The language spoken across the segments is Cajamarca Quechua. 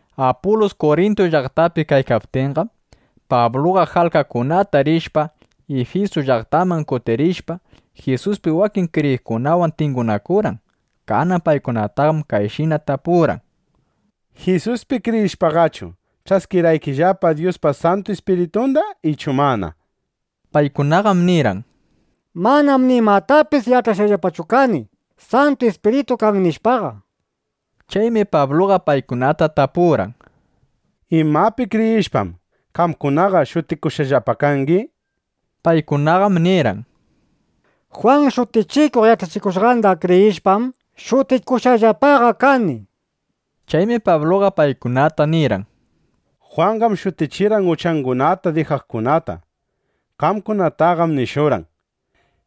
Apulus Kurintu llaqtapi kaykaptinqam, Pabluqa jalkakunata rishpa, Ifisu llaqtaman kutirishpa, Jisuspi wakin kriyiqkunawan tingunakurqan. Kanan paykunataqam kayshina tapurqan: —¿Jisuspi kriyishpaqachu, ch'askirqaykillapa Dyuspa Santu Ispiritunda ichu mana? nishpa. Paykunaqam nirqan: —Manam nimatapis yach'ashqallapachu kani: Santu Ispiritu kan, nishpaqa. Chaymi Pabluqa paykunata tapurqan: —¿Imapi kriyishpam, qamkunaqa shutikushqallapa kangi? nishpa. Paykunaqam nirqan: —Jwan Shutichikuq yach'achikushqanda kriyishpam, shutikushqallapaqa kani, nishpa. Chaymi Pabluqa paykunata nirqan: —Jwanqam shutichirqan uchangunata dijaqkunata. Qamkunataqam nishurqan: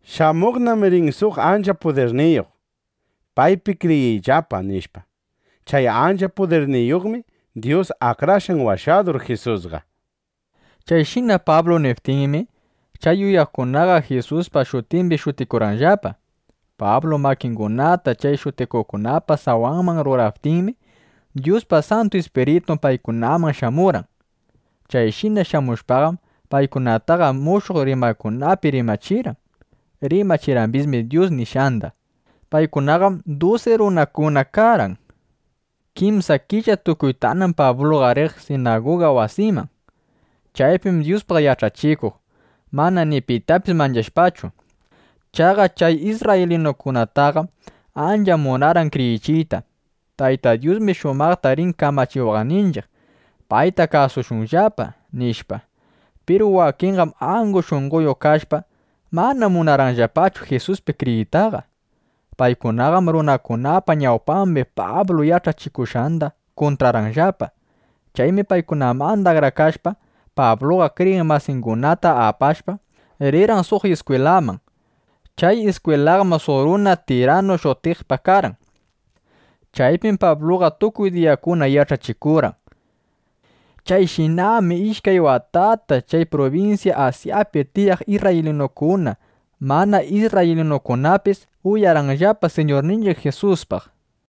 “Shamuqnam rin suq ancha pudirniyuq. Paypi kriyiyllapa”, nishpa. Chay ancha pudirniyuqmi Dyus Akrashqan Washadur Jisusqa. Chayshina Pablu niptinmi, chay uyaqkunaqa Jisuspa shutimbi shutikurqanllapa. Pablu makingunata chay shutikuqkunapa sawanman ruraptinmi, Dyuspa Santu Ispiritun paykunaman shamurqan. Chayshina shamushpaqam, paykunataqa mushuq rimaykunapi rimachirqan. Rimachirqambismi Dyus nishqanda. Paykunaqam dusi runakuna karqan. Kimsa killa tukuytanam Pabluqa riq sinaguga wasiman. Chaypim Dyuspaq yach'achikuq, mana ni pitapis manchashpachu. Chaqa chay isrraylinukunataqam ancha munarqan kriyichiyta: —Tayta Dyusmi shumaqta rin kamachiwaqninchiq. Payta kasushunllapa, nishpa. Piru wakinqam angu shunqoyuq kashpa, mana munarqanllapachu Jisuspi kriyiytaqa. Paykunaqam runakunapa ñawpambi Pablu yach'achikushqanda kuntrarqanllapa. Chaymi paykunamanda akrakashpa, Pabluqa kriyiq masingunata apashpa, rirqan suq iskwilaman. Chay iskwilaqam suq runa Tiranu shutiqpa karqan. Chaypim Pabluqa tukuy diyakuna yach'achikurqan. Chayshinam ishkay watata chay prubinsya Asyapi tiyaq isrraylinukuna, mana isrraylinukunapis uyarqanllapa Siñurninchiq Jisuspaq.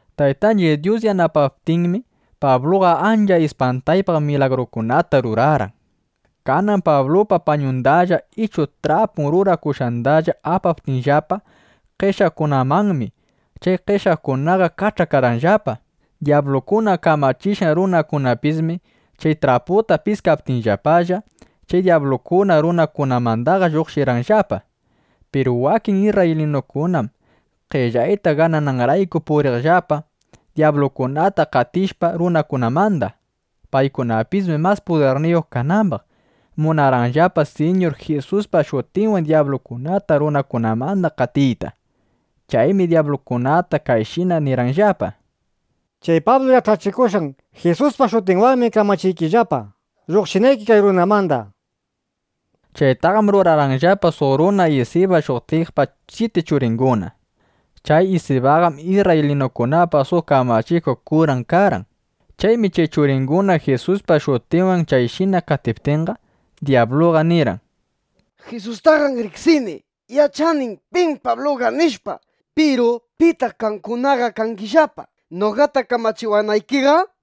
Taytanchiq Dyus yanapaptinmi, Pabluqa ancha ispantaypaq milagrukunata rurarqan. Kanan Pablupa pañundalla ichu trapun rurakushqandalla apaptinllapa qeshyaqkunamanmi, chay qeshyaqkunaqa kach'akarqanllapa. Dyablukuna kamachishqan runakunapismi chay trapunda piskaptinllapalla, chay dyablukuna runakunamandaqa lluqshirqanllapa. Piru wakin isrraylinukunam qellayta ganananrayku puriqllapa, dyablukunata qatishpa runakunamanda. Paykunapismi mas pudirniyuq kanambaq, munarqanllapa Siñur Jisuspa shutinwanna dyablukunata runakunamanda qatiyta. Chaymi dyablukunata kayshina nirqanllapa: —Chay Pablu yach'achikushqan Jisuspa shutinwanmi kamachiykillapa, lluqshinayki kay runamanda, nishpa. Chaytaqam rurarqanllapa suq runa Isiba shutiqpa syiti churinguna. Chay Isibaqam isrraylinukunapa suq kamachikuq kuran karqan. Chaymi chay churinguna Jisuspa shutinwan chayshina qatiptinqa, dyabluqa nirqan: —Jisustaqam riqsini. Yach'anim pim Pabluqa, nishpa. Piru ¿pitaq qamkunaqa kangillapa noqata kamachiwanaykiqa? nishpa.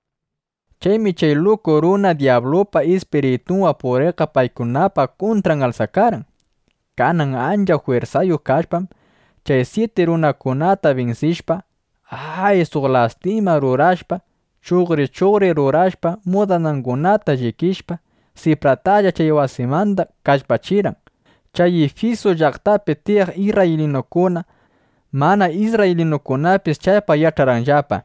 Chaymi chay luku runa dyablupa ispiritunwan puriqqa paykunapa kuntran alsakarqan. Kanan ancha jwirsayuq kashpam, chay syiti runakunata binsishpa, ¡ay! suq lastima rurashpa, chuqri chuqri rurashpa, mudanangunata llikishpa, sipratalla chay wasimanda kallpachirqan. Chay Ifisu llaqtapi tiyaq isrraylinukuna, mana isrraylinukunapis chaypaq yach'arqanllapa.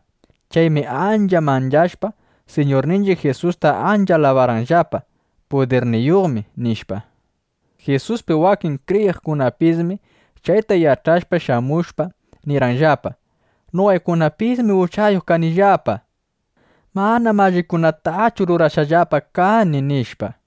Chaymi ancha manchashpa, Siñurninchiq Jisusta ancha alabarqanllapa: “Pudirniyuqmi”, nishpa. Jisuspi wakin kriyiqkunapismi chayta yach'ashpa, shamushpa, nirqanllapa: —Noqaykunapismi uchayuq kanillapa. Manam allikunatachu rurashqallapa kani, nishpa.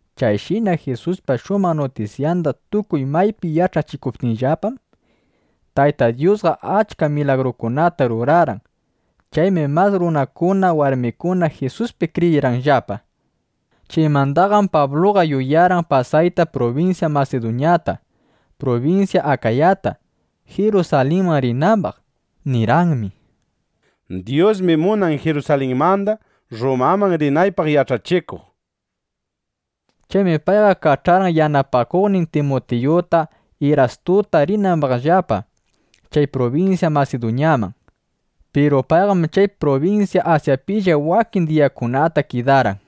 Chayshina Jisuspa shumaq nutisyanda tukuy maypi yach'achikuptinllapam, Tayta Dyusqa achka milagrukunata rurarqan. Chaymi mas runakuna, warmikuna Jisuspi kriyirqanllapa. Chaymandaqam Pabluqa yuyarqan pasayta prubinsya Masiduñata, prubinsya Akayata, Jirusalinman rinambaq. Nirqanmi: —Dyusmi munan Jirusalinmanda Rrumaman rinaypaq yach'achikuq, nishpa. Chaymi payqa kach'arqan yanapakuqnin Timutiyuta, Irastuta, rinambaqllapa chay prubinsya Masiduñaman. Piru payqam chay prubinsya Asyapilla wakin diyakunata kidarqan.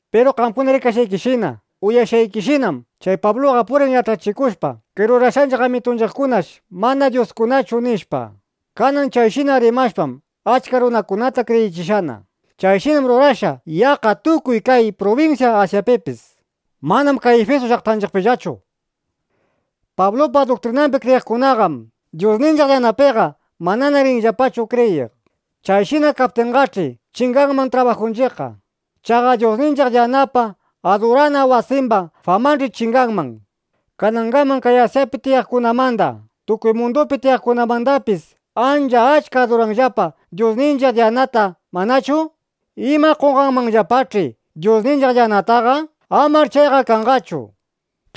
Piru qamkuna rikashqaykishina, uyashqaykishinam, chay Pabluqa purin yach'achikushpa kay rurashqanchiq amitunchiqkunash mana dyuskunachu, nishpa. Kanan chayshina rimashpam, achka runakunata kriyichishqana. Chayshinam rurashqa yaqqa tukuy kay prubinsya Asyapipis. Manam kay Ifisu llaqtanchiqpillachu. Pablupa duktrinambi kriyiqkunaqam dyusninchiq Diyanapiqa manana rinllapachu kriyiq. Chayshina kaptinqach'i, chinganman trabajunchiqqa. Chaqa dyusninchiq Diyanapa adurana wasimba famanch'i chinganman. Kanangaman kay Asyapi tiyaqkunamanda, tukuy mundupi tiyaqkunamandapis ancha achka aduranllapa dyusninchiq Diyanata, ¿manachu? ¡Ima qonqanmanllapach'i dyusninchiq Diyanataqa! ¡Amar chayqa kanqachu! nishpa.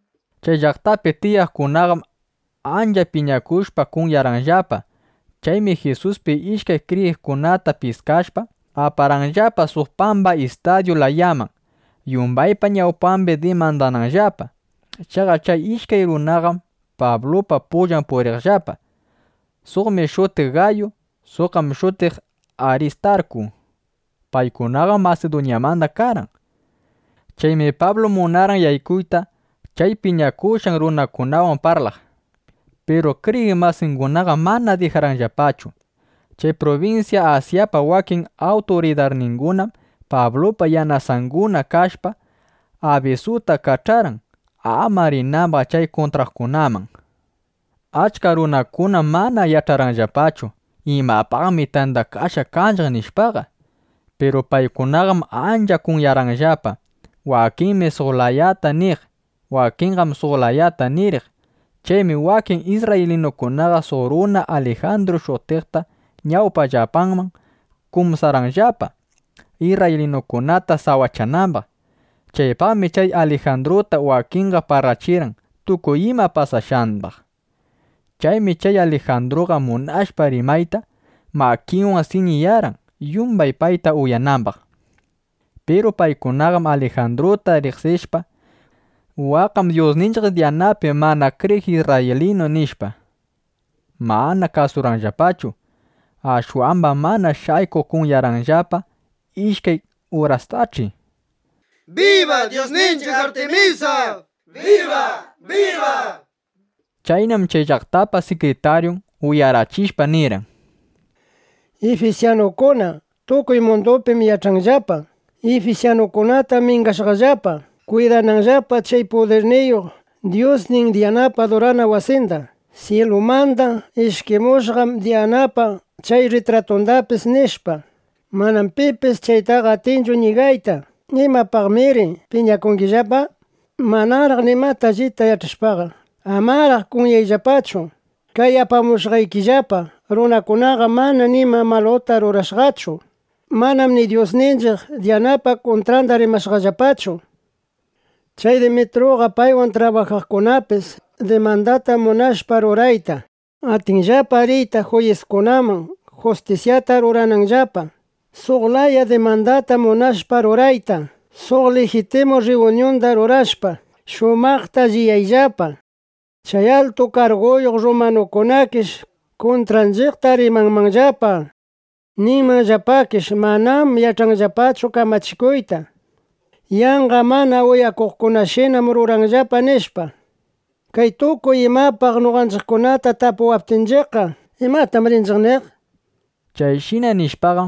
Chay llaqtapi tiyaqkunaqam ancha piñakushpa kunyarqanllapa. Chaymi Jisuspi ishkay kriyiqkunata piskashpa, aparqanllapa suq pamba istadyu layaman, yumbaypa ñawpambi dimandananllapa. Chaqa chay ishkay runaqam Pablupa pullan puriqllapa. Suqmi shutiq Gayu. Suqqam shutiq Aristarku. Paykunaqam Masiduñamanda karqan. Chaymi Pablu munarqan yaykuyta, chay piñakushqa runakunawan parlaq. Piru kriyiq masingunaqam mana dijarqanllapachu. Chay prubinsya Asyapa wakin awturidarningunam Pablupa yanasunguna (yanasanguna) kashpa, abisuta kach'arqan, ama rinambaq chay kuntraqkunaman. Achka runakunam mana yach'arqanllapachu: Imapaqmi tandakashqa kanchiq, nishpaqa. Piru paykunaqam ancha kunyarqanllapa. Wakinmi suq layata niq. Wakinqam suq layata niriq. Chaymi wakin isrraylinukunaqa suq runa Alijandru shutiqta ñawpanllapaman kumsarqanllapa, isrraylinukunata sawachanambaq. Chaypaqmi chay Alijandruta wakinqa parlachirqan tukuy ima pasashqambaq. Chaymi chay Alijandruqa munashpa rimayta, makinwan siñiyarqan, yumbay payta uyanambaq. Piru paykunaqam Alijandruta riqsishpa: Waqqam dyusninchiq Diyanapi mana kriyiq isrraylinu, nishpa, mana kasurqanllapachu. Ashwambam mana shaykuq kunyarqanllapa ishkay urastach'i: —¡Biba ifisyanukunapa dyusninchiq Diyana! nishpa. Chaynam chay llaqtapa sikritaryun, uyarachishpa, nirqan: —Ifisyanukuna, tukuy mundupim yach'anllapa: Ifisyanukunatam mingashqallapa, kwidananllapa chay pudirniyuq dyusnin Diyanapa adurana wasinda, syilumanda ishkimushqan Diyanapa chay rritratundapis, nishpa. Manam pipis chaytaqa atinchu ñigayta. ¿Imapaqnamiri piñakungillapa? Manaraq nimata allita yach'ashpaqa, amaraq kunyayllapachu. Kay apamushqaykillapa runakunaqam mana nima maluta rurashqachu. Manam ni dyusninchiq Diyanapa kuntranda rimashqallapachu. Chay Demetruqa paywan trabajaqkunapis dimandata munashpa rurayta, atinllapa riyta juyiskunaman, justisyata rurananllapa. Suq laya dimandata munashpa rurayta, suq lijitimu rriyuñunda rurashpa, shumaqta alliyayllapa. Chay altu karguyuq rrumanukunakish kuntranchiqta rimanmanllapa. Ninmanllapakish “Manam yach'anllapachu kamachikuyta. Yanqa mana uyakuqkunashinam ruranllapa”, nishpa. Kay tukuy imapaq noqanchiqkunata tapuwaptinchiqqa, ¿imatam rinchiq niq? nishpa.